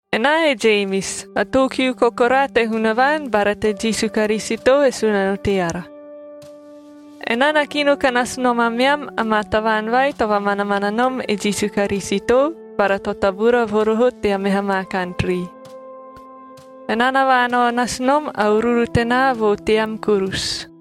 Enaa e Jemis, a too kiu kokoraa te Hunavaan bara te Jisu Karisito, e Sunano teara. Enaa na kino ka nasu nom ameam amaa tavaan vai to vamanamana nom e Jisu Karisitoa bara to tabura vo roho tea meha maa kantrii. Enaa na vaanao nasu nom a uruuru tenaa vo team kurusu.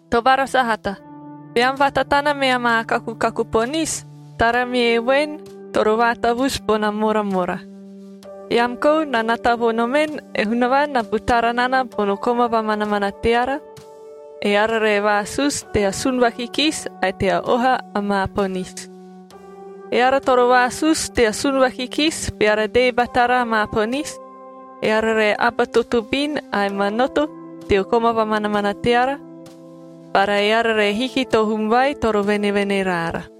Tobara sahata, beam vatatana mea maa kakukaku ponisi, tara mie voen, toro vaatavusu bona moramora. Eam kou na nata vo nomen, e Hunavaan na butara nana bono koma vamanamana teara, eara re vaasusu tea sun vakikisi ae tea oha amaa ponisi. Eara toro vaasusu tea sun vakikisi beara dee batara amaa ponisi, eara re aba totobin ae manoto teo koma vamanamana teara, bara eara re hiki to hum vai toro venevene raara.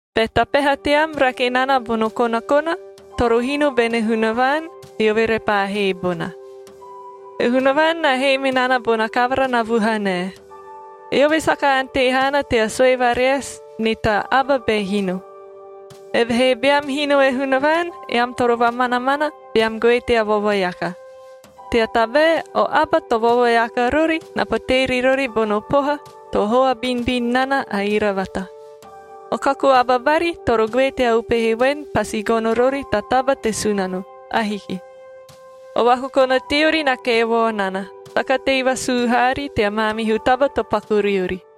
Be ta peha team rake nana bono konakona, toro hino bene Hunavaan, eove repaa hee bona. E Hunavaan na hee me nana bona kavara na vuhanae. Eove saka ante haana tea sue vareasi ni ta aba be hino. Evehee beam hino e Hunavaan, eam toro vamanamana, beam goe tea vovoeaka, tea tabae o aba to vovoeaka rori na potee ri rori bono poha to hoa binubinu nana a iravata. O kaku aba bari toro goe tea upehe voen, pasi gono rori ta taba te Sunano. Ahiki. O vakokona teori na kevao nana, saka tei vasuu haari tea maamihu taba to paku riori.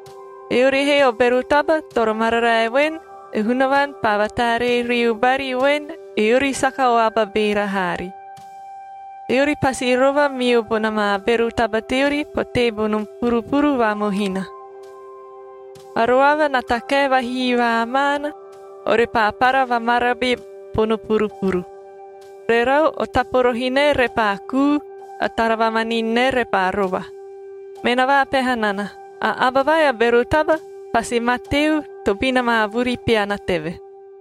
Eori he o bero taba toro mararae voen, e Hunavaan paa vataaree riu bari voen eori saka o aba beera haari.c Eori pasi rova miu bona maa bero taba teori potee bono purupuru va mohina. A roava na takae vahihivaa maana, orepaa para vamarabi bono purupuru. Rerau, o taporohi nae repaa kuu, a tara vamanin nae repaa rova. Me na vaapeha nana, a aba vai a bero taba pasi mateu tobina maa vuri peana teve.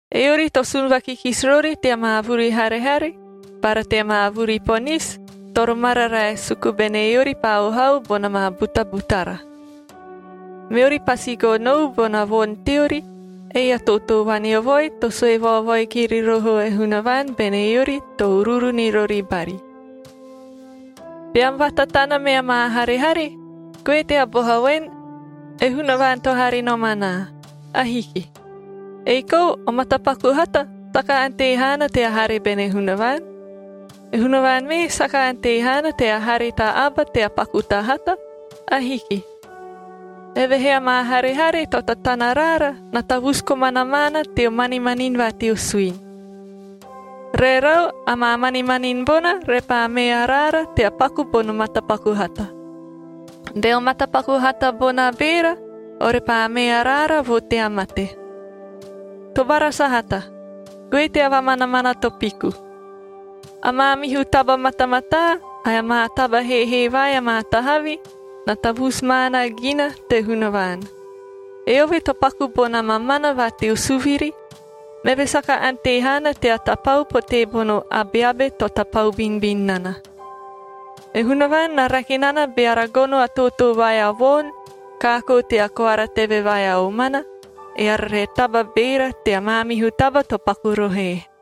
Eori to sun vakikisi rori tea maa vuri harehare bara tea maa vuri ponisi, toro mararae suku bene eori paa ohau bona maa butabutara. Meori pasi gonou bona voni teori, ei a tootoo vaneovoi to sue vaovoi kiri roho e Hunavaan bene eori to uruuru ni rori bari. Beam vatatana mea maa harehare, goe tea boha voen, “E Hunavaan to hare nom anaa.” Ahiki. Ei kou o matapaku hata saka ante haana tea hare bene Hunavaan. E Hunavaan mee saka ante haana tea hare ta aba tea paku ta hata. Ahiki. Evehee amaa harehare to tatana raara na tavusu komana maana teo manimanini va teo suini. Rerau, amaa manimanini bona repaa mee araara tea paku bono matapaku hata. Beo matapaku hata bona beera, orepaa mee araara vo tea mate. Tobara sahata, goe tea vamanamana to piku. A maamihu taba matamataa, ae amaa taba heehee vai amaa tahavi na tavusu maana gina te Hunavaan. Eove to paku bona mamana va teo suviri, meve saka ante haana tea tapau potee bono abeabe to tapau binubinu nana. E Hunavaan na rake nana beara gono a tootoo vai a voon kaakoo tea koara teve vai a omana, eara re taba beera tea maamihu taba to paku rohoe.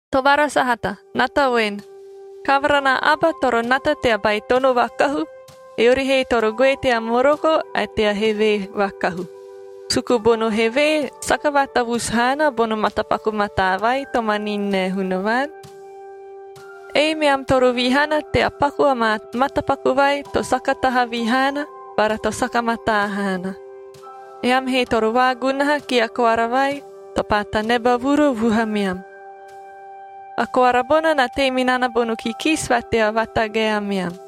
Tobara sahata, nata voen: Kavara na aba toro nata tea baitono vakahu, eori he toro goe tea moroko ae tea hevee vakahu, suku bono hevee saka vaatavusu haana bono matapaku mataa vai to manini nae Hunavaan. Ei meam toro vihana tea paku amaa matapaku vai to saka tahavi haana bara to saka mataa haana. Eam he toro vaagunaha kia koara vai to paa taneba vuru vuhameam. A koara bona na tei me nana bono kikisi va tea vatagae ameam.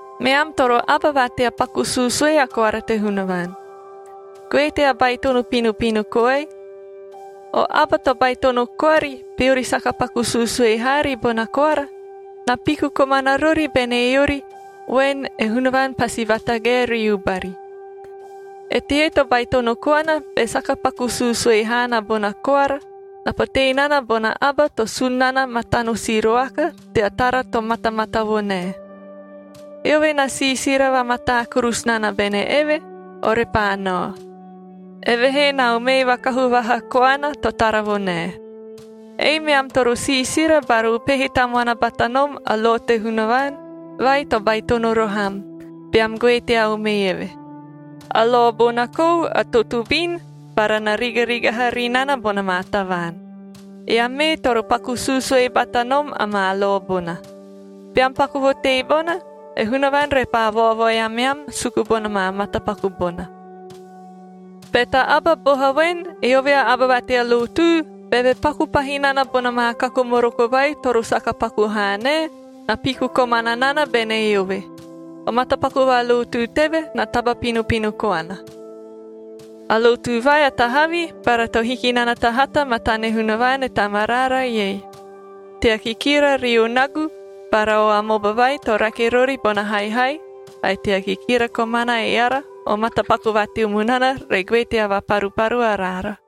Meam toro aba va tea paku suusue a koara te Hunavaan. Goe tea baitono pinopino koai. O aba to baitono koari, beori saka paku suusue haari bona koara, na piku komana rori bene eori voen e Hunavaan pasi vatagae riu bari. Eteie to baitono koana, be saka paku suusue haana bona koara, na potee nana bona aba to sun nana matano siroakad tea tara to matamata vo nae. Eove na siisira vamatamataa kurusu nana bene eve, orepaa nao. Evehee na umee vakahu vaha koana to tara vo nae. Ei meam toro siisira bara upehe tamuana bata nom a lo te Hunavaan vai to baitono roho am, beam goe tea umee eve. A lo bona kou a totobin bara na rigarigaha ri nana bona maa tavaan. Eam mee toro paku suusue bata nom amaa lo bona. Beam paku vo teebona, e Hunavaan repaa vaovoi ameam suku bona maa matapaku bona. Be ta aba boha voen, eove a aba va tea lotu, beve paku pahi nana bona maa kaku moroko vai toro saka paku haa nae, na piku komana nana bene eove. O matapaku va lotu teve na taba pinopino koana. A lotu vai a tahavi bara to hiki nana ta hata matane Hunavaan, e Tamaraara ei: tea kikira rio nagu bara o amoba vai to rake rori bona haihai ae tea kikira komana eara, o matapaku va teo munana re goe tea vaparuparu araara.